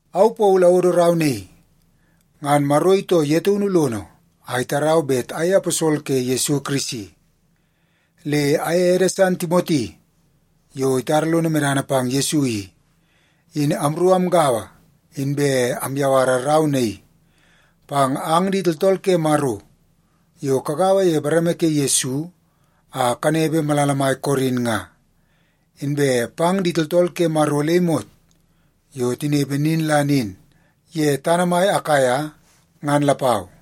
Au Paulu awodo rau naii. Ngan Maro itoo ye taunu lono a itarau bet ayei aposol ke Yesu Kirisi. Le aye ede san Timoti, yo itara lon medana pang Yesu i, in amru amgaua inbe amyawara rau naii pang ang di tooltool ke Maro yo kagaua ye bareme ke Yesu a kanepe malala mai Korin nga, inbe pang di tooltool ke Maro le imot yo tinepe nin la nin ye tana mai Akaia ngan lapau.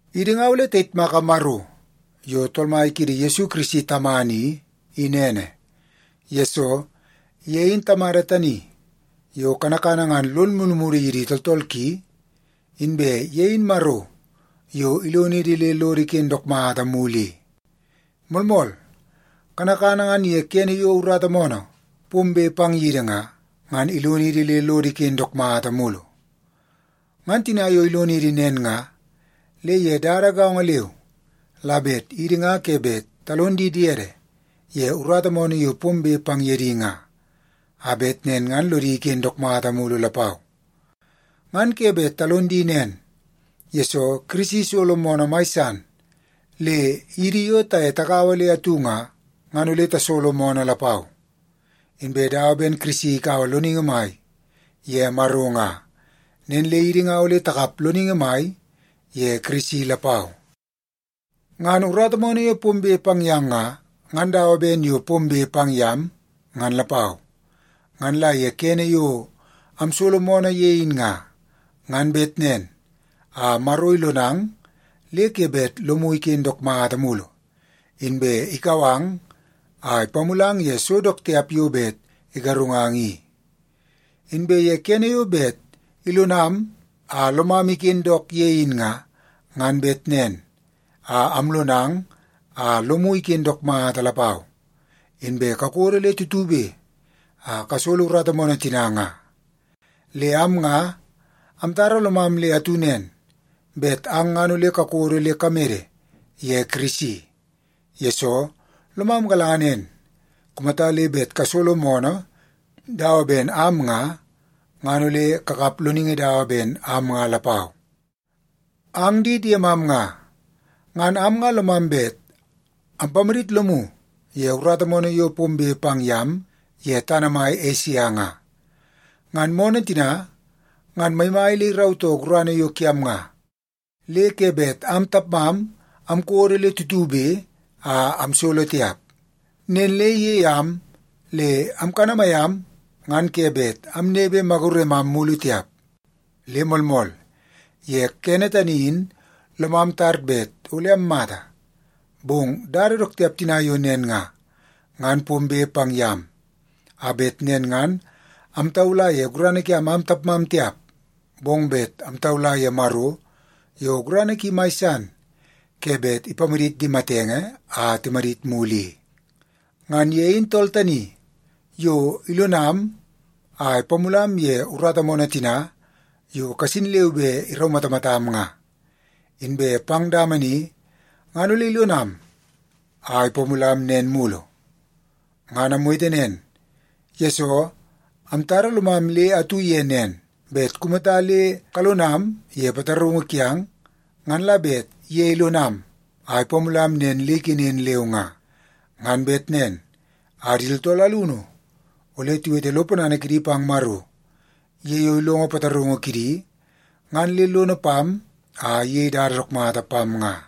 Idi nga ole tayitmaka Maro yo Tool Mai kiidi Yesu Kirisi Tamana i, in ene. Yesoo, ye in Tamada tani yo kanakana ngan lon mulumulu yidi tooltool ki, inbe ye in Maro yo ilonidi le lodo iken dook mata mulu i. Moolmool, kanakana ngan ye kene yo urata moonoo pombe pang yidi nga, ngan ilonidi le lodo iken dook mata mulu. Ngan tina yo ilonidi nen nga, le ye dada gaongo leu la bet idi nga ke bet talon di diede ye urata moonoo yo pombe pang ye di nga, a bet nen ngan lodi iken dook mata mulu lapau. Ngan ke bet talon di nen, yesoo Kirisi isolo moonoo mai san, le idi yo taye tagaua le atu nga, ngan ole tasolo moonoo lapau. Inbe dawa ben Kirisi ikaua loningi mai ye Maro nga, nen le idi nga ole takap loningi mai ye Kirisi lapau. Ngan urata moonoo yo pombe pang yang nga, ngan dawa ben yo pombe pang yam, ngan lapau. Ngan la ye kene yo amsolo moonoo ye in nga, ngan bet nen a Maro ilonang le ke bet lomu iken dook mata mulu, inbe ikau ang a ipamulang ye so dook tiap yo bet igarungang i. Inbe ye kene yo bet ilonam a lomam iken dook ye in nga, ngan bet nen a amlonang a lomu iken dook mata lapau, inbe kakodo le tutube a kasolo urata moonoo tina nga. Le am nga amtara lomam le atu nen, bet ang ngan ole kakodo le kamede ye Kirisi. Yesoo, lomam galanga nen, kumata le bet kasolo moonoo dawa ben am nga, ngan ole kakap loningi dawa ben am nga lapau. Ang di diemam nga, ngan am nga lomam bet ampamadit lomu ye urata moonoo yo pombe pang yam ye tana mai Esia nga. Ngan moonoo tina ngan maimai le irautoo gurana yo kiam nga, le ke bet am tapmam amkodo le tutube a amsolo tiap. Nen le iyei am le amkanamai am ngan ke bet amnepe maguremam mulu tiap. Le moolmool, ye kene tani in lomam tar bet ole ammata. Bong dada dook tiap tina yo nen nga, ngan pombe pang yam, a bet nen ngan amtaula ye gurana kiam am tapmam tiap, bong bet amtaula ye Maro yo gurana ki mai san ke bet ipamadit di matenge a timadit mulu i. Ngan ye in tool tani yo ilonam a ipamulam ye urata moonoo tina yo kasin leu be iraumatamatam nga. Inbe pang dama ni ngan ole ilonam a ipamulam nen mulu. Ngan amwete nen, yesoo amtara lomam le atu ye nen, bet kumata le kalonam ye pataraungu kiang, ngan la bet ye ilonam a ipamulam nen le ikenen leu nga. Ngan bet nen a di tooltool alunu ole tiwete lo ponana kidi pang Maro ye yo ilongo pataraungu kidi ngan le lono pam a iyei dada dook mata pam nga.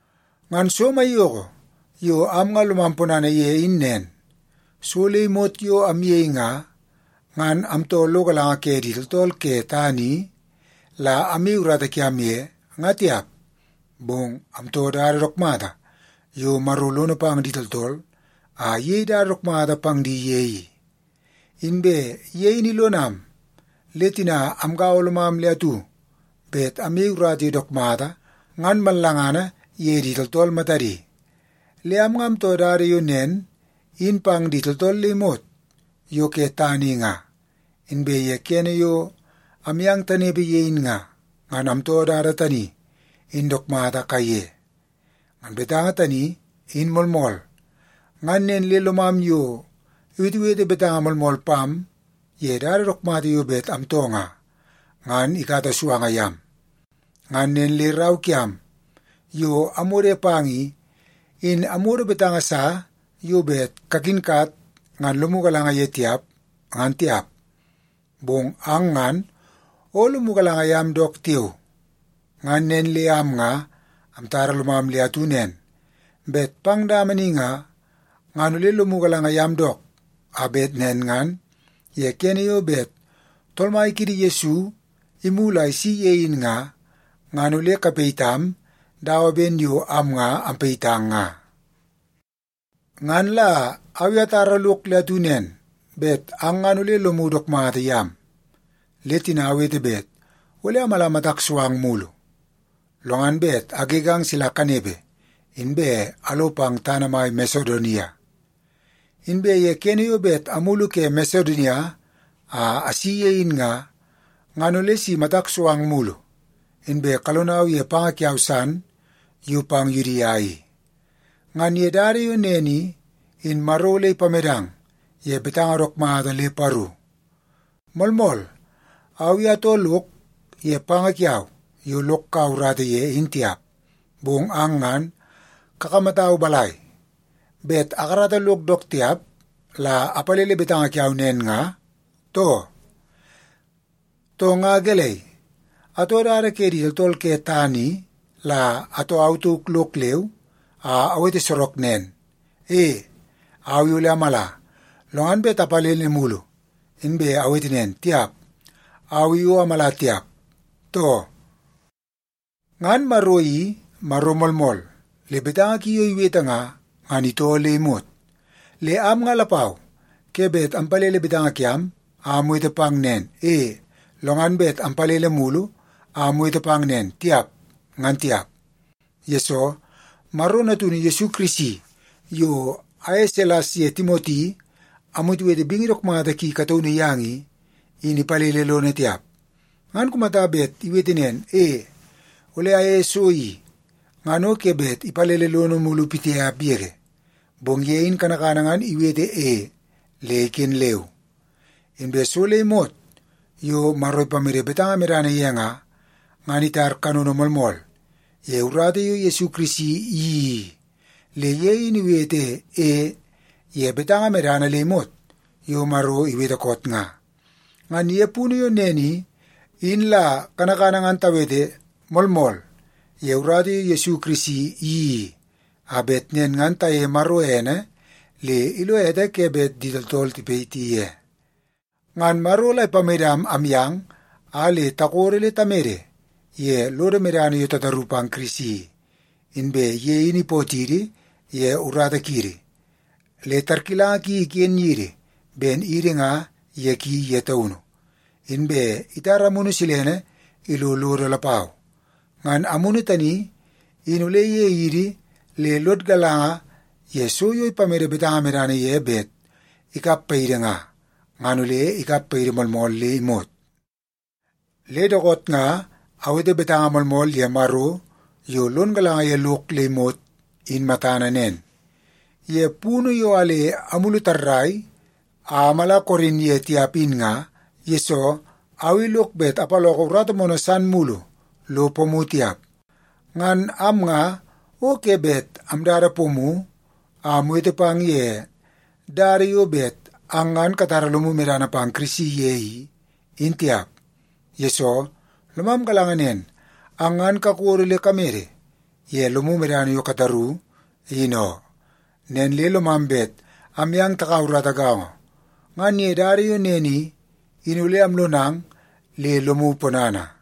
Ngan so maiyoko yo am nga lomam ponana ye in nen, so le imot yo amyei nga, ngan amtoo lo galanga ke di tooltool ke tana i la amyei urata kiam ye, nga tiap, bong amtoo dada dook mata yo Maro lono pang di tooltool a iyei dada dook mata pang di ye i. Inbe ye in ilonam, le tina amgaua lomam le atu bet amyei urata yo dook mata ngan mallangana ye di tooltool matadi. Le am nga amtoo dada yo nen in pang di tooltool le imot yo ke tana i nga, inbe ye kene yo amyang tanepe ye in nga, ngan amtoo dada tani in dook mata kaiye. Ngan betanga tani, in moolmool, ngan nen le lomam yo iwetewete betanga moolmool pam ye dada dook mata yo bet amtoo nga, ngan ikata suanga yam. Ngan nen le rau kiam yo amwode pang i, in amwodo betanga sa yo bet kakinkat ngan lomu galanga ye tiap, ngan tiap. Bong ang ngan o lomu galanga yam dook tiao. Ngan nen le am nga amtara lomam le atu nen, bet pang dama ni nga, ngan ole lomu galanga yam dook, a bet nen ngan ye kene yo bet Tool Mai kiidi Yesu imulu a isi ye in nga, ngan ole kapayitam dawa ben yo am nga ampayitang nga. Ngan la au i atara lok le atu nen, bet ang ngan ole lomu dook mata yam, le tina awete bet ole amala matak so ang mugu, lo ngan bet agegang sila kanepe, inbe alo pang tana mai Masedonia. Inbe ye kene yo bet amulu ke Masedonia a asi ye in nga, ngan ole si matak so ang mulu, inbe kalonau ye panga kiau san yo pang Yudia i. Ngan ye dada yo nen i, in Maro ole ipamedang ye betanga dook mata le paru. Moolmool, au i atoo lok ye panga kiau yo lok kaua urata ye in tiap. Bong ang ngan kakamatau balai, bet akarata lok dook tiap la apalele betanga kiau nen nga, too? Too, nga gelei, atoo dada ke di tooltool ke tana i la atoo au tauk lok leu a awete sorok nen, “E, au i ole amala”, lo ngan bet apalele mulu inbe awete nen, “Tiap, au i o amala tiap”, too? Ngan Maro i Maro moolmool, le betanga ki yo iwete nga, ngan itoo le imot. Le am nga lapau ke bet ampalele betanga kiam a amwete pang nen, “E”, lo ngan bet ampalele mulu a awete pang nen, “Tiap”, ngan tiap. Yesoo, Maro Natunu Yesu Kirisi yo aye Silas ye Timoti amwetewete bingi dook mata ki kataunu yang i, in ipalele lono tiap. Ngan kumata bet iwete nen, “E, ole ayeie so i,” ngan o ke bet ipalele lono mulu pitiap yege. Bong ye in kanakana ngan iwete “E” le iken leu. Inbe so le imot yo Maro ipamede betanga medana ye nga, ngan itar kanono moolmool ye urata yo Yesu Kirisi iyeii i. Le ye in iwete “E” ye betanga medana le imot yo Maro iwete koot nga. Ngan ye punu yo nen i, in la kanakana ngan tawete “Moolmool” ye urata yo Yesu Kirisi iyeii i, a bet nen ngan tayeie Maro ene le ilo ete ke bet di tooltool tipayiti ye. Ngan Maro la ipamedam amyang a le takodo le tamede ye lodo medana yo tataru pang Kirisi i. Inbe ye in ipootidi ye urata kiidi, le tarkilanga ki iken yidi ben idi nga ye ki ye taunu, inbe itara Amunu Silene ilo lodo lapau. Ngan Amunu tani in ole iyei idi le lod galanga ye so yo ipamede betanga medana ye bet ikap paidi nga, ngan ole ikap paidi moolmool le imot. Le dookoot nga awete betanga moolmool ye Maro yo lon galanga ye lok le imot in matana nen. Ye punu yo a le amulu tarrai a amala Korin ye tiap in nga, yesoo au i lok bet apaloko urata moonoo san mulu lo pomu tiap. Ngan am nga o ke bet amdada pomu a amwete pang ye dada yo bet ang ngan katara lomu medana pang Kirisi ye i, in tiap, yesoo lomam galanga nen, ang ngan kakodo le kamede ye lomu medana yo kataru, in oo. Nen le lomam bet amyang takaua urata gaongo, ngan ye dada yo nen i, in ole amlonang le lomu ponana.